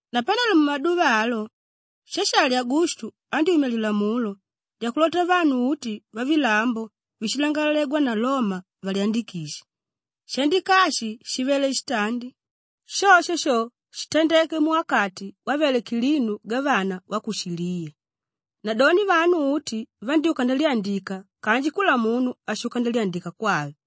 Napanelo mumaduva alo Shashali Agustu andyúmya lilamulo lyakulota vanu uti vavilambo víshilangalalegwa na Loma valyandikishe. Shaandika ashi shivele shitandi; shosho sho shitandeke muwakati wavele Kilinu gavana wa ku Shiliya. Nadoni vanu uti vandyúka ndalyandika kanji kula munu ashuka ndalyandika kwave.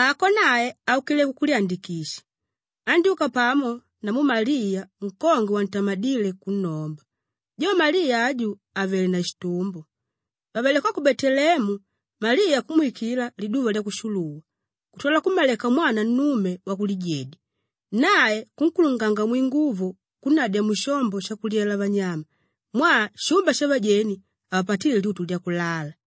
Ako nae aukile kukulyandikisha; andyúka pamo namu Maliya nkongwe wantamadíle kunnomba, jo Maliya aju àvele na shitumbo. Vàvele ko ku Beteleemu, Maliya kumwikila liduva lyakushuluwa kutwala kummaleka mwana nnume wakulijedya. Nae kunkulunganga mwinguvo kunnadya mushombo shakulyela vanyama mwaa shumba shavajeni havapatíle lyutu lyakulala.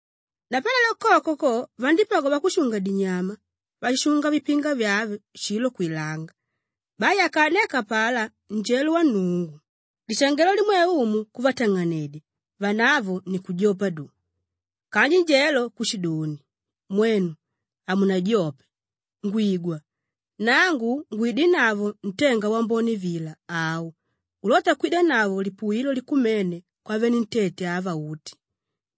Napanelo koko ko vandípagwa vakushunga-dinyama váshishunga vipinga vyave shilo kwilanga. Bai akaaneka apalá njelo wa Nnungu, lishangelo limwe Umu kuvatang'anedya vanavo ni kujopa doni. Kanji njelo kushidoni, “Mwenu, hamunajope! Ngwigwa, nangu ngwidinavo ntenga wambone vila au ulóta kwidanavo lipuwilo likumene kwavenentete ava uti.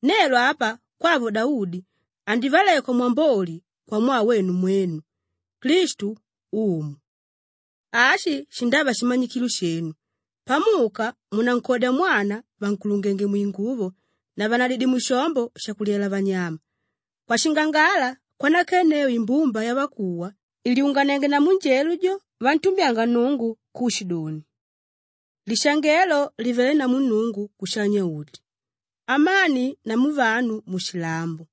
Nelo apa kwavo Daudi andivalekwa mwamboli kwamwaa wenu mwenu; Klistu, Umu. Ashi shindava shimanyikilo shenu: pamuka, munankodya mwana vànkulungenge mwinguvo na vànnadidye mushombo shakulyela vanyama.” Kwashingangala kwanakenneu imbumba yavakuwa ìlyunganienge namu njelo jo vantumbyanga Nnungu kushidoni, “Lishangelo livelé namu Nnungu kushanya-uti; amani namu vanu mushilambo,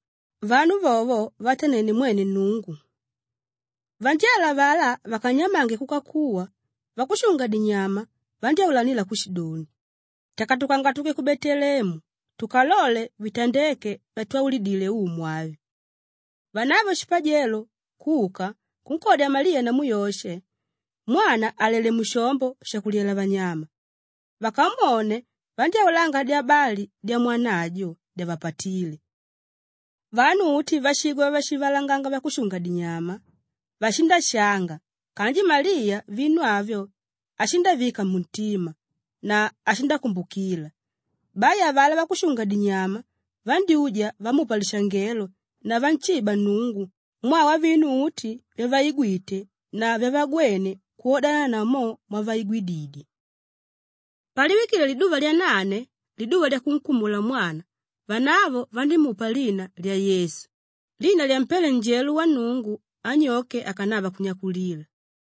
vanu vovo vavatanene mwene Nnungu.” Vanjelo avalá vakanyamange kuka kuwa, vakushunga-dinyama vandyáulanila kushidoni, “Takatukanga tuke ku Beteleemu tukalole vitandéke vyatwaulidile Umu avi.” Vanavo shipajelo kuka kunkodya Maliya namu Yoshe, mwana àlele mushombo shakulyela vanyama. Vakamwone, vandyáulanga dyabali dyamwana ajo dyavapatíle. Vanu uti váshigwa vyavashivalanganga vakushunga-dinyama, vashindashanga kanji Maliya vinu avyo ashindavika muntima na ashindakumbukila. Bai avalá vakushunga-dinyama vandyúja vamupa lishangelo na vanshiba Nnungu mwaa wavinu uti vyavaigwite na vyavagwene kwodana na mo mwavaigwididye. Paliwikile liduva lyanane, liduva lyakunkumula mwana vanavo vandímupa lina lya Yesu, lina lyampéle njelo wa Nnungu anyoke akanava kunnyakulila.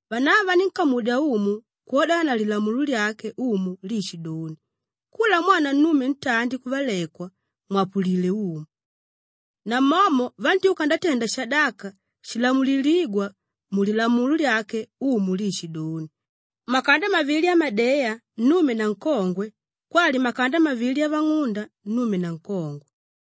Vanavo vanínkamudya Umu kwodana na Lilamulo lyake Umu liishidoni, “Kula mwana nnume ntandi kuvalekwa, mwapulile Umu.” Namomo vandyúka ndatenda shadaka shilamulilígwa mu Lilamulo lyake Umu liishidoni, “makanda mavili amadeya nnume na nkongwe kwali makanda mavili avang'unda nnume na nkongwe.”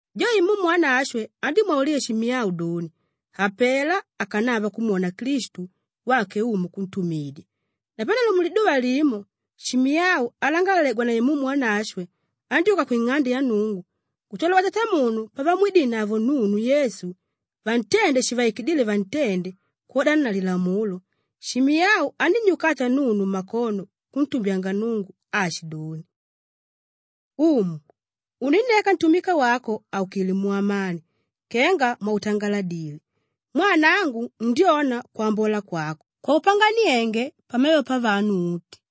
Jo Imumu Wanashwe andímwaulila Shimiyau doni, hapela akanava kumwona Klistu wake Umu kuntumidya. Napanelo muliduva limo, Shimiyau alangalalegwa na Imumu Wanashwe andyúka kwing'ande ya Nnungu kutwala vatatamunu pavamwidinavo nunu Yesu vantende shivaikidíle vantende kwodana na Lilamulo, Shimiyau anínnyukata nunu mmakono kuntumbyanga Nnungu aashidoni, “Umu, uninneka ntumika wako aukilé mu amani kenga mwautangaladile. Mwaa nangu ndyona kwambola kwako kwaupanganienge pamevo pavanu uti;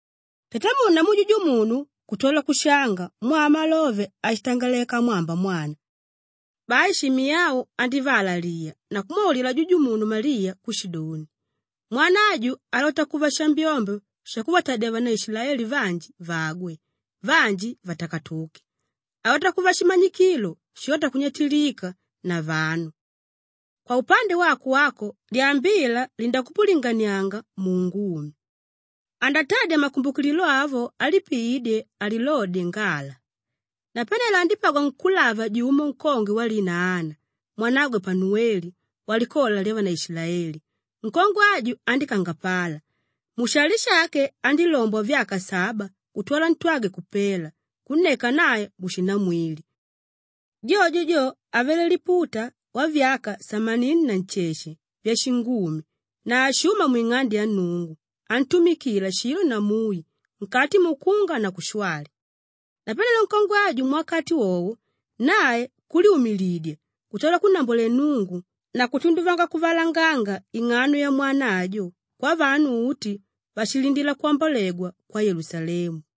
Tatamunu namu jujumunu kutwala kushanga mwaa wamalove áshitangaleka amwamba mwana. Bai Shimiyau andívaalaliya na kumwaulila jujumunu Maliya kushidoni, “Mwana aju alota kuva shambyombyo shakuvatadya vanaishilaeli vanji vagwe, vanji vatakatuke; alota kuva shimanyikilo shilóta kunyatilika na vanu. Kwaupande wako wako lyambila lindakupulinganianga muungumi. Andatadya makumbukililo avo alipiídye alilodye ngala.” Napanelo andípagwa nkúlava jumo nkongwe walina Ana mwanagwe Panuweli walikola lyavanaasheli. Nkongwe aju andíkangapala. Mushali shake andílombwa vyaka saba kutwala ntwagwe kupela kunneka nae mushinamwili. Jojo jo avele liputa wavyaka samanini na nsheshe vyashingumi na hashuma mwing'ande ya Nnungu antumikila shilo na mui nkati mukunga na kushwali. Napanelo nkongwe aju muwakati wowo, nae kulyumilidya kutwala kunnambwalela Nnungu na kutunduvanga kuvalanganga ing'ano yamwana ajo kwavanu uti váshilindila kwambolegwa kwa Yelusalemu.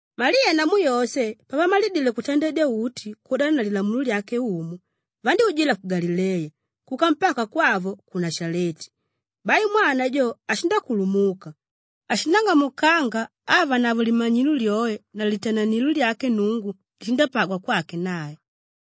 Maliya namu Yoshe pavamalidile kutandedya uti kwodananavo Lilamulo lyake Umu, vandyújila ku Galileya kuka mpaka kwavo ku Nashaleti. Bai mwana jo ashindakulumuka, ashindang'amukanga avanavo limanyilo lyoe na litananilo lyake Nnungu lishandapagwa kwake nae.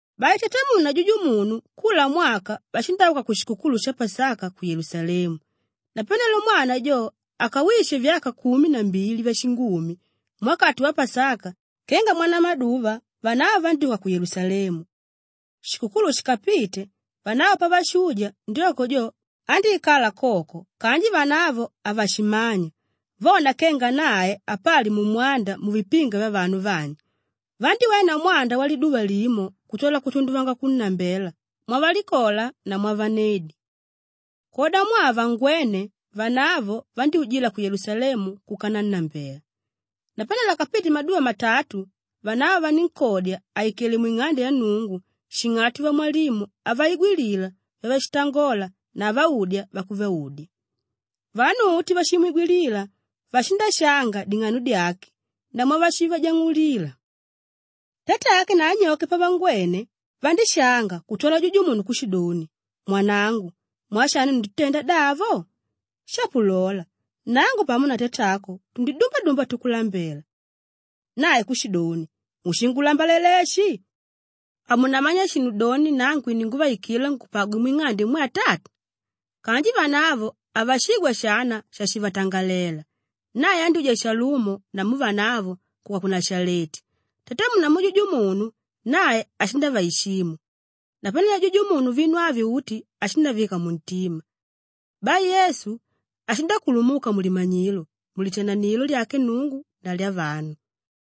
Bai tatamunu na jujumunu kula mwaka vashindauka kushikukulu sha Pasaka ku Yelusalemu. Napanelo mwana jo akawishe vyaka kumi na mbili vyashingumi, muwakati wa Pasaka kenga mwanamaduva vanavo vandyúka ku Yelusalemu. Shikukulu shikapite, vanavo pavashuja ndyoko jo andíikala koko kanji vanavo havashimanya vona kenga nae apali mumwanda muvipinga vyavanu vanji, vandíwena mwanda waliduva limo kutwala kutunduvanga kunnambela mwavalikola na mwavanedi. Kwodamwaa havangwéne, vanavo vandyújila ku Yelusalemu kuka nannambela. Napanelo akapite maduva matatu, vanavo vanínkodya àikele mwing'ande ya Nnungu shing'ati vamwalimu avaigwilila vyavashitangola na avaudya vyakuvaudya. Vanu uti váshimwigwilila, vashindashanga ding'ano dyake na mwavashivajang'ulila. Tatake na anyoke pavangwene, vandíshanga kutwala jujumunu kushidoni, “Mwanangu, mwaa shani unditutenda davo? Shapo lola, nangu pamo na tatako tundidumbadumba tukulambela.” Nae kushidoni, “Mushingulambalela eshi? Hamunamanya shinu doni nangu ininguvaikila ngupagwe mwing'ande imwe Atata?” Kanji vanavo havashigwa shana shashivatangalela. Nae andyúja shalumo namu vanavo kuka ku Nashaleti; tatamunu namu jujumunu nae ashindavaishimu. Napanelo jujumunu vinu avi uti ashindavika muntima. Bai Yesu ashindakulumuka mulimanyilo, mulitananilo lyake Nnungu na lyavanu.